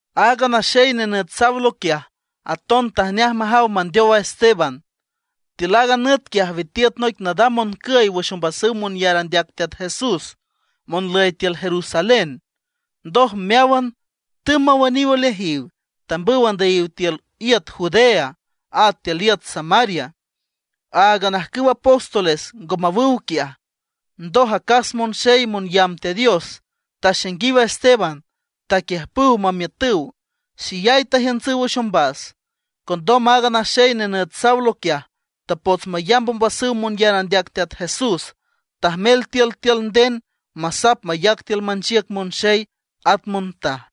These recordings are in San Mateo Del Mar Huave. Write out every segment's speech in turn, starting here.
Aaga naxey nenüt Saulo quiaj, aton tajneaj majaw mandeow a Esteban. Tiül aaga nüt quiaj, witiüt noic nadam moncüy wüx ombasüw monyar andeac Teat Jesús monlüy tiül Jerusalén. Ndoj meáwan tümb mawüniw oleajiw, tambüw andüyiw tiül iüt Judea, at tiül iüt Samaria. Áagan ajcüw apóstoles ngo mawüw quiaj. Ndoj acas monxey monyamb Teat Dios taxainguiw a Esteban, taquiüjpüw mamiütüw, xeyay tajiüntsüw wüx ombas. Condom aaga naxey nenüt Saulo quiaj, tapots mayamb ombasüw monyar andeac Teat Jesús. Tajmel tiültiül nden masap mayac tiül manchiüc monxey at montaj.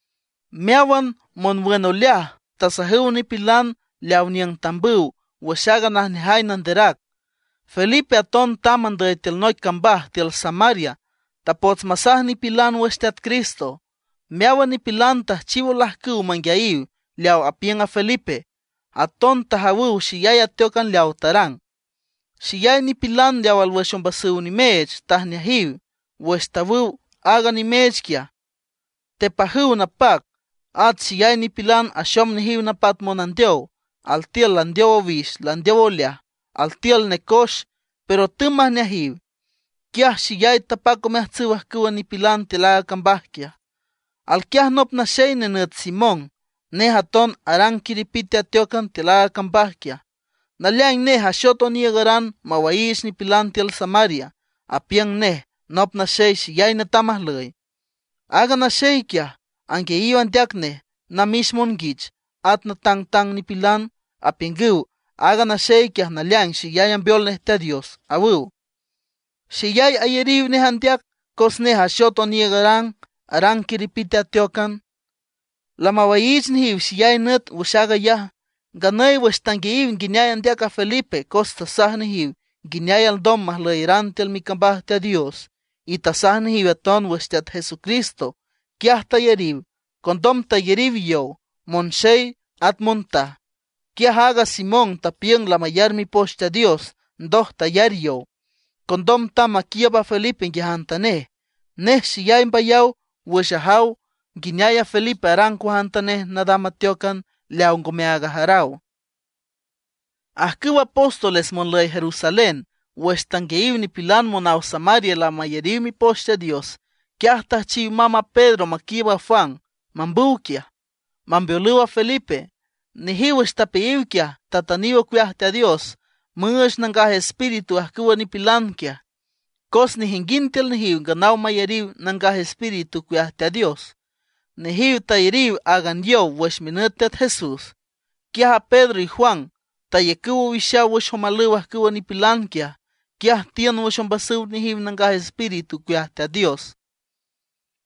Meáwan monwün oleaj tasajüw nipilan leaw niüng tambüw wüx aaga najneajay nanderac. Felipe aton tamb andüy tiül noic cambaj tiül Samaria, tapots masaj nipilan wüx Teat Cristo. Meáwan nipilan tüjchiw olajcüw manguiayiw leaw apiüng Felipe, aton tajawüw xeyay ateócan leaw tarang. Xeyay nipilan leaw alwüx ombasüw nimeech, tajneajiw. Wüx tawüw aaga nimeech quiaj, tepajüw napac. At xeyay nipilan axom nejiw napat monandeow, altiül landeow owix landeow oleaj, altiül necoex, pero tümb majneajiw. Quiaj xeyay tapac omeajtsüw ajcüwa nipilan tiül aaga cambaj quiaj. Alquiaj nop naxey nenüt Simón. Nej aton arang quiripite ateócan tiül aaga cambaj quiaj. Naleaing nej axot oniiügaran mawaiich nipilan tiül Samaria. Apiüng nej nop naxey xeyay netam ajlüy. Aaga naxey quiaj, anguiayiw andeac nej namix monguich at natangtang nipilan, apiüngüw: ―Aaga naxey quiaj, naleaing xeyay ambeol nej Teat Dios ―awüw. Xeyay ayariw nej andeac, cos nej axot oniiügaran arang quiripite ateócan. Lamawaiich nejiw xeyay nüt wüx aag ayaj. Nganüy wüx tanguiayiw nguineay andeac a Felipe cos tasaj nejiw nguineay alndom majlüyeran tiül micambaj Teat Dios; y tasaj nejiw aton wüx Teat Jesucristo, quiaj tayariw. Condom tayariw yow, monxey at montaj. Quiaj aaga Simón tapiüng lamayar Mipoch Teat Dios, ndoj tayar yow. Condom tamb maquiiüb a Felipe nguiajantanej. Nej xeyay mbayaw wüx ajaw nguineay a Felipe arang cuajantanej nadam ateócan leaw ngomeaag ajaraw. Ajcüwa apóstoles monlüy Jerusalén, wüx tanguiayiw nipilan monaw Samaria lamayariw Mipoch Teat Dios, quiaj tüjchiw mamb a Pedro maquiiüb a Juan mambüw quiaj, mambeolüw a Felipe. Nejiw wüx tapeayiw quiaj, tatüniw ocueaj Teat Dios müüch Nangaj Espíritu ajcüwa nipilan quiaj. Cos nejinguind tiül nejiw nganaw mayariw Nangaj Espíritu ocueaj Teat Dios. Nejiw tayariw áagan yow wüx minüt Teat Jesús. Quiaj a Pedro y Juan tayacüw owixaw wüx omalüw ajcüwa nipilan quiaj, quiaj tiün wüx ombasüw nejiw Nangaj Espíritu ocueaj Teat Dios.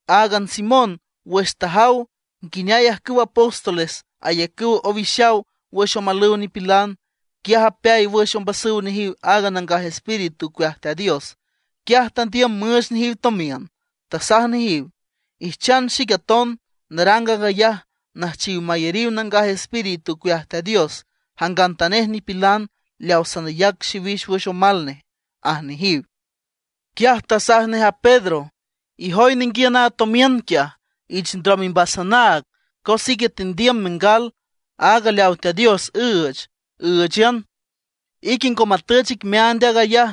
Aaga Simón wüx tajaw nguineay ajcüwa apóstoles ayacüw owixaw wüx omalüw nipilan, quiaj apeay wüx ombasüw nejiw aaga Nangaj Espíritu ocueaj Teat Dios. Quiaj tandiüm müüch nejiw tomiün. Tasaj nejiw: ―Ijchan xic aton narang aag ayaj, nüjchiw mayariw Nangaj Espíritu ocueaj Teat Dios jangantanej nipilan leaw sanayac xiwix wüx omal nej ―aj nejiw. Quiaj tasaj nej a Pedro: ―Ijoy ninguiün aaga tomiün quiaj, ich ndrom imbas anaag, cos ique tendiüm mengal aaga leaw Teat Dios üüch, ǘüchan. Ique ngo matüch ic meaand aag ayaj,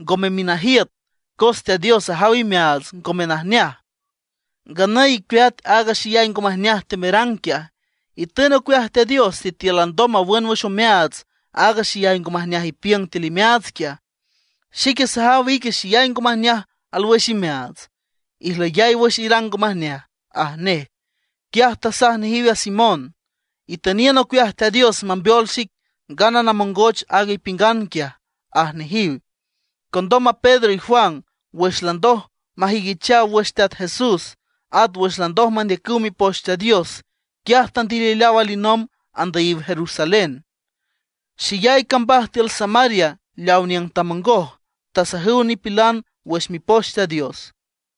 ngome minajiüt, cos Teat Dios ajaw imeaats ngome najneaj. Nganüy icueat aaga xeyay ngo majneaj temerang quiaj, itün ocueaj Teat Dios sitiül alndom mawün wüx omeaats aaga xeyay ngo majneaj ipiüng tiül imeaats quiaj. Xique sajaw ique xeyay ngo majneaj alwüx imeaats. Ijlüyay wüx irang ngo majneaj ―aj nej. Quiaj tasaj nejiw a Simón: ―Itüniün ocueaj Teat Dios mambeol xic, ngana namongoch aaga ipiüngan quiaj ―aj nejiw. Condom a Pedro y Juan, wüx landoj majüiquichaw wüx Teat Jesús, at wüx landoj mandeacüw Mipoch Teat Dios, quiaj tandilileaw alinomb andüyiw Jerusalén. Xeyay cambaj tiül Samaria leaw niüng tamongoj, tasajüw nipilan wüx Mipoch Teat Dios.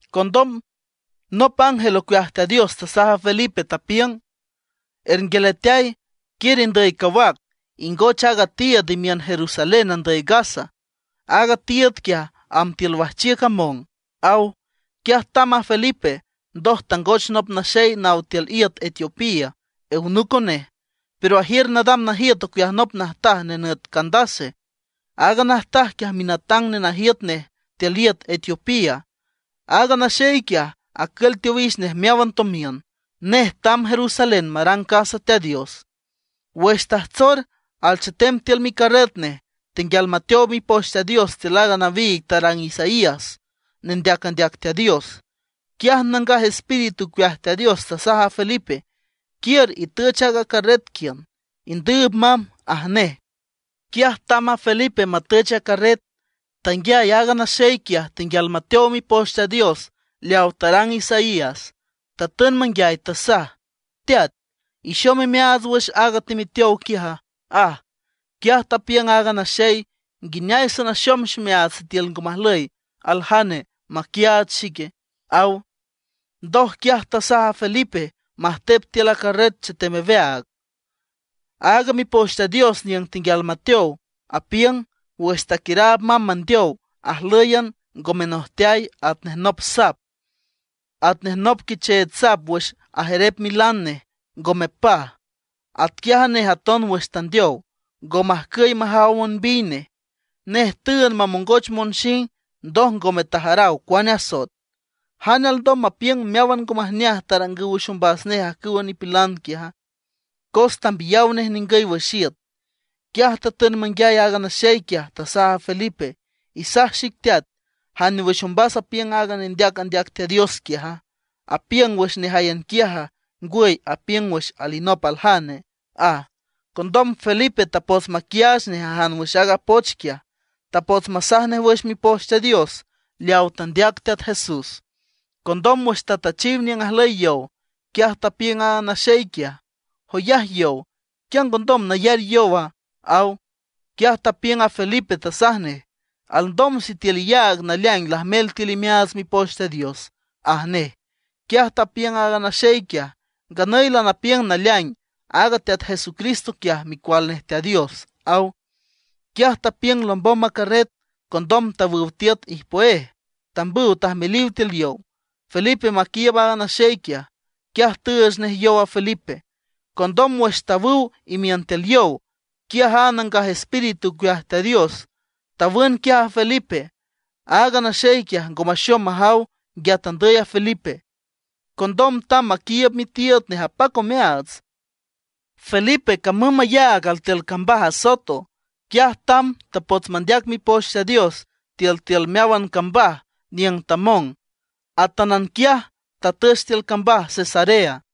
Condom nop ángel ocueaj Teat Dios tasaj a Felipe, tapiüng: ―Ernguialeateay, quiür indüy cawac, ingoch aaga tiiüd imiün Jerusalén andüy Gaza. Aaga tiiüd quiaj, amb tiül wajchiüc among ―aw. Quiaj tamb a Felipe. Ndoj tangoch nop naxey naw tiül iüt Etiopía, eunuco nej, pero ajiür nadam najiüt ocueaj nop najtaj nenüt Candace. Aaga najtaj quiaj minatang nenajiüt nej tiül iüt Etiopía. Aaga naxey quiaj, acül teowix nej meáwan tomiün. Nej tamb Jerusalén marang casa Teat Dios. Wüx tajtsor alchetem tiül micarret nej, tenguial mateow Mipoch Teat Dios tiül aaga nawiig tarang Isaías, nendeac andeac Teat Dios. Quiaj Nangaj Espíritu ocueaj Teat Dios tasaj a Felipe: ―Quiür itüch aaga carret quiün, indüüb mamb ―aj nej. Quiaj tamb a Felipe matüch a carret. Tanguiay aaga naxey quiaj tenguial mateow Mipoch Teat Dios leaw tarang Isaías. Tatün manguiay, tasaj: ―¿Teat, ixom imeaats wüx aag temeteow quiaja? ―aj. Quiaj tapiüng aaga naxey: ―¿Nguineay sanaxom ximeaats sitiül ngo majlüy aljane maquiaach xic? ―aw. Ndoj quiaj tasaj a Felipe majtep tiül a carret chetem aweaag. Aaga Mipoch Teat Dios niüng tenguial mateow, apiüng: Wüx taquiüraab mamb mandeow, ajlǘyan ngo menojteay, atnej nop sap. Atnej nop quicheech sap wüx ajerep milan nej, ngo mepaj. Atquiaj a nej aton wüx tandeow, ngo majcüy majaw monbiy nej. Nej tüünd mamongoch monxing, ndoj ngome tajaraw cuane asoet. ¿Jane alndom mapiüng meáwan ngo majneaj tarangüw wüx ombas nej ajcüwa nipilan quiaja? Cos tambiyaw nej ningüy wüx iüt. Quiaj tatün manguiay aaga naxey quiaj, tasaj a Felipe: ―Isaj xic teat, ¿jane wüx ombas apiüng aaga nendeac andeac Teat Dios quiaja? ¿Apiüng wüx nejáyan quiaja, ngwüy apiüng wüx alinop aljane? ―aj. Condom Felipe tapots maquiaach nej ajan wüx aaga poch quiaj. Tapots masaj nej wüx Mipoch Teat Dios leaw tandeac Teat Jesús. Condom wüx tatüchiw niüng ajlüy yow, quiaj tapiüng aaga naxey quiaj: ―Joyaj yow ¿quia ngondom nayar yowa? ―aw. Quiaj tapiüng a Felipe, tasaj nej: ―Alndom sitiül iyaag naleaing lajmel tiül imeaats Mipoch Teat Dios ―aj nej. Quiaj tapiüng aaga naxey quiaj: ―Nganüy lanapiüng naleaing aaga Teat Jesucristo quiaj Micual nej Teat Dios ―aw. Quiaj tapiüng lombom a carret. Condom tawüw tiüt ijpüéj, tambüw tajmeliw tiül yow, Felipe maquiiüb aaga naxey quiaj. Quiaj tüüch nej yow a Felipe. Condom wüx tawüw imiün tiül yow, quiaj a Nangaj Espíritu ocueaj Teat Dios tawün quiaj a Felipe. Aaga naxey quiaj, ngo maxom majaw nguia tandüy a Felipe. Condom tamb maquiiüb mitiiüd nej apac omeaats. Felipe camüm mayaag altiül cambaj Azoto. Quiaj tamb tapots mandeac Mipoch Teat Dios tiültiül meáwan cambaj niüng tamong, atánan quiaj tatüch tiül cambaj Cesarea.